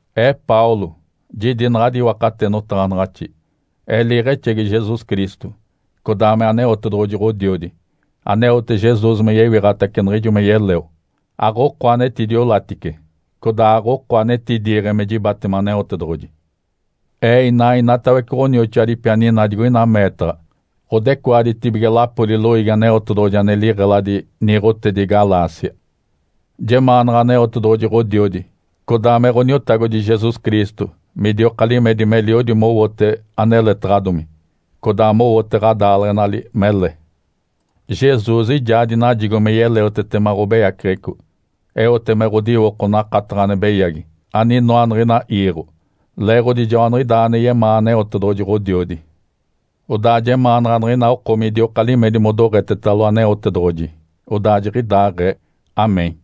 Ee, Paulo, jidi naɡ̶adi iwakate notaɡ̶anaɡ̶axi. Ee liiɡ̶exegi Jesus Cristo, codaa me Aneotedoɡ̶oji Ǥodiodi, aneote Jesus me yewiɡ̶atace niɡ̶ijo me yeleo. Aɡ̶oko anetidiolatice, codaa aɡ̶oko anetidiiɡ̶e me jibatema Aneotedoɡ̶oji. Ee inaa inatawece ɡ̶onioxoadipi aninaa digoina meetaɡ̶a ɡ̶odecoaditibige lapoli loiigi Aneotedoɡ̶oji ane liɡ̶eladi niiɡ̶otedi Galácia. Jemaanaɡ̶a Aneotedoɡ̶oji, Ǥodiodi, codaa me Ǥoniotagodi Jesus Cristo midioka limedi meliodi mowote aneletaɡ̶adomi, codaa mowote ɡ̶adaaleɡ̶enali mele. Jesus ijaa dinajigo me yeleotetema ɡ̶obeyaceɡ̶eco, eote me ɡ̶odiwoko nakataɡ̶a ane beyagi aninoa niɡ̶ina iiɡ̶o. Leeɡ̶odi joaniɡ̶idaa ane yemaa Aneotedoɡ̶oji Ǥodiodi. Odaa jemaanaɡ̶a niɡ̶ina oko midioka limedi modoɡ̶etetalo Aneotedoɡ̶oji. Odaa jiɡ̶idaaɡ̶ee. (Amém.)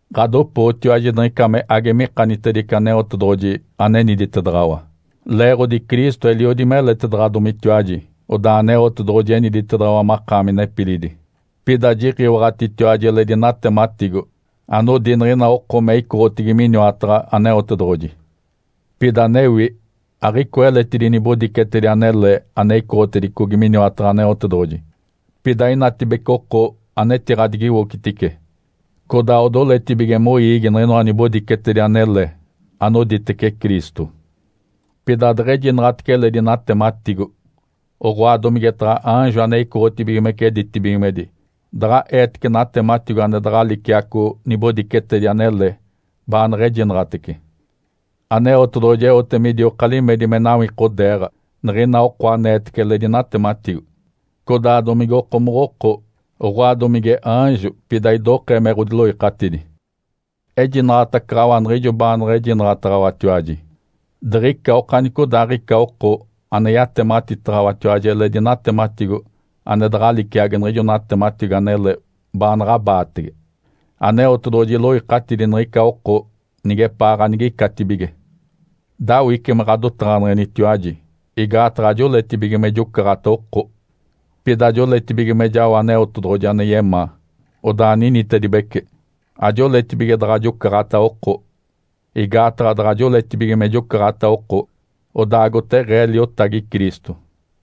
Ǥadopootiwaji niɡ̶ica me age mikanitedice Aneotedoɡ̶oji aneniditedaɡ̶awa. Leeɡ̶odi Cristo eliodi meletedaɡ̶adomitiwaji, odaa Aneotedoɡ̶oji eniditedaɡ̶awa makaami nepilidi. Pida jiɡ̶iwaɡ̶atitiwaji eledi natematigo anodi niɡ̶ina oko me icoɡ̶otigi miniwataɡ̶a Aneotedoɡ̶oji. Pida anewi, aɡ̶icoa eletidi nibodicetedi anele ane icoɡ̶otedicogi miniwataɡ̶a Aneotedoɡ̶oji. Pida inatibece oko anetiɡ̶adigiwocitice, codaa odoletibige moiigi niɡ̶inoa nibodicetedi anele anoditece Cristo. Pida deɡ̶ejinaɡ̶atece eledi natematigo, oɡ̶oa domigetaɡ̶a aanjo ane icoɡ̶otibigimece ditibigimedi daɡ̶a eetece natematigo ane daɡ̶a liciaco nibodicetedi anele baaneɡ̶ejinaɡ̶atece, Aneotedoɡ̶oji eote midioka limedi me nawikodeeɡ̶a niɡ̶ina oko aneetece eledi natematigo, codaa domigokomoɡ̶oko, oɡ̶oa domige aanjo, pida idokee me ɡ̶odiloikatidi. Ejinaɡ̶atacaɡ̶awa niɡ̶ijo baaneɡ̶ejinaɡ̶ataɡ̶awatiwaji. Diɡ̶ica okanicodaaɡ̶ica oko ane yatematitaɡ̶awatiwaji eledi natematigo ane daɡ̶a liciagi niɡ̶ijo natematigo anele baanaɡ̶a abaatege, Aneotedoɡ̶oji iloikatidi niɡ̶ica oko nigepaa ganigicatibige. Dawice me ɡ̶adotaɡ̶aneɡ̶enitiwaji igaataɡ̶a ajoletibige me jocaɡ̶ata oko. Pida joletibige me jao Aneotedoɡ̶oji ane yemaa, odaa ninitedibece. Ajoletibige daɡ̶a jocaɡ̶ata oko, igaataɡ̶a daɡ̶a joletibige me jocaɡ̶ata oko, odaa agoteɡ̶ee liotagi Cristo.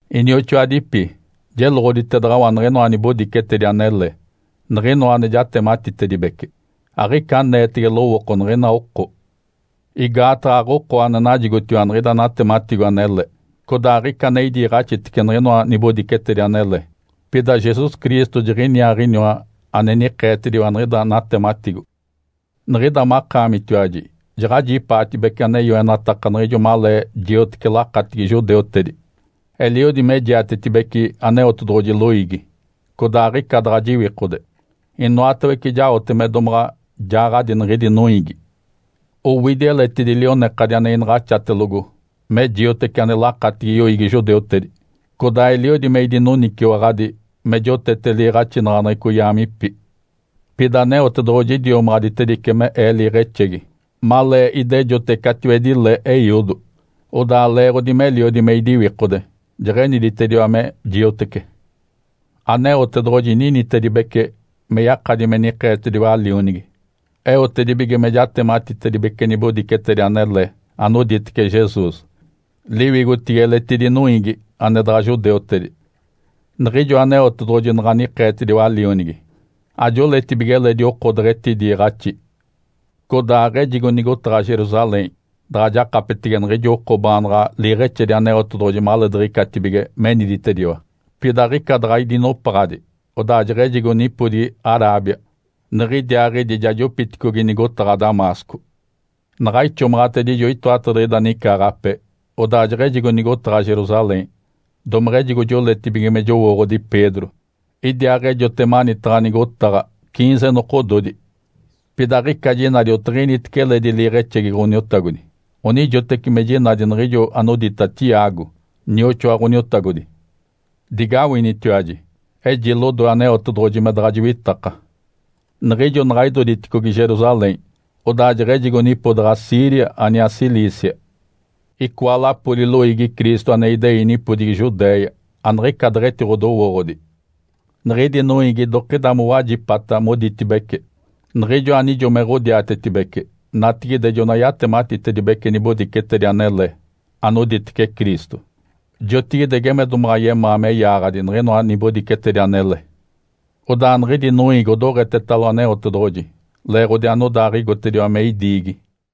Inioxoadipi, jeloɡ̶oditedaɡ̶awa niɡ̶inoa nibodicetedi anele, niɡ̶inoa ane jatematitedibece, aɡ̶ica aneetege lowooko niɡ̶ina oko. Igaataɡ̶a aɡ̶oko ane najigotiwa niɡ̶ida natematigo anele, codaa aɡ̶ica ane idiiɡ̶axitece niɡ̶inoa nibodicetedi anele. Pida Jesus Cristo jiniaaɡ̶iniwa ane nikeetediwa niɡ̶ida natematigo. Niɡ̶ida makaamitiwaji jaɡ̶ajipaatibece ane yoenataka niɡ̶ijo malee jioteci lakatigi judeutedi. Eliodi me jiatetibeci Aneotedoɡ̶oji loiigi, codaa aɡ̶ica daɡ̶a jiwikode. Inoatawece jaote me domaɡ̶a jaaɡ̶adi niɡ̶idi noiigi. Owidi eletidi lionekadi ane inaɡ̶axatelogo me jioteci ane lakatigi yoiigi judeutedi. Codaa eliodi me idinoniciwaɡ̶adi me jotete liiɡ̶axinaɡ̶aneɡ̶eco yaamipi. Pida Aneotedoɡ̶oji idiomaɡ̶aditedice me ee liiɡ̶exegi malee idejote catiwedi le eiodo. Odaa leeɡ̶odi meliodi me idiwikode, jeɡ̶eniditediwa me jiotece. Aneotedoɡ̶oji ninitedibece me yakadi me nikeetediwa Lionigi, eotedibige me jatematitedibece nibodicetedi anele anoditece Jesus, liwigotigi eletidi noiigi ane daɡ̶a judeutedi. Niɡ̶ijo Aneotedoɡ̶oji naɡ̶a nikeetediwa Lionigi, ajoletibige eledi oko deɡ̶etidiiɡ̶axi. Codaa aɡ̶ejigo nigotaɡ̶a Jerusalém daɡ̶a jakapetege niɡ̶ijo oko baanaɡ̶a liiɡ̶exedi Aneotedoɡ̶oji maleediɡ̶icatibige meniditediwa. Pida aɡ̶ica daɡ̶a idinopaɡ̶adi odaa jeɡ̶ejigo nipodigi Arábia, niɡ̶idiaaɡ̶idi ja jopitacicogi nigotaɡ̶a Damasco. Naɡ̶a ixomaɡ̶atedijo itoatadiɡ̶ida nicaaɡ̶ape, odaa jeɡ̶ejigo nigotaɡ̶a Jerusalém, domeɡ̶ejigo joletibige me jowooɡ̶odi Pedro. Idiaaɡ̶ejote manitaɡ̶a nigotaɡ̶a ciinze nokododi. Pida aɡ̶ica jinadi otiɡ̶initece eledi liiɡ̶exegi Ǥoniotagodi, onijoteci me jinadi niɡ̶ijo anodita Tiago, nioxoa Ǥoniotagodi. Digawinitiwaji! Eji lodoe Aneotedoɡ̶oji me daɡ̶a jiwitaka. Niɡ̶ijo naɡ̶a idoditicogi Jerusalém, odaa jeɡ̶ejigo nipodaɡ̶a Síria aniaa Cilícia. Icoa lapoli loiigi Cristo ane idei nipodigi Judéia aniɡ̶ica deɡ̶etidowooɡ̶odi. Niɡ̶idi noiigi idokida mowajipa moditibece, “Niɡ̶ijo anijo me ɡ̶odiatetibece, natigide jona yatematitedibece nibodicetedi anele anoditece Cristo. Jotigide geme domaɡ̶a yemaa me yaaɡ̶adi niɡ̶inoa nibodicetedi anele.” Odaa niɡ̶idi noiigi odoɡ̶etetalo Aneotedoɡ̶oji leeɡ̶odi anodaaɡ̶igotediwa me idiigi.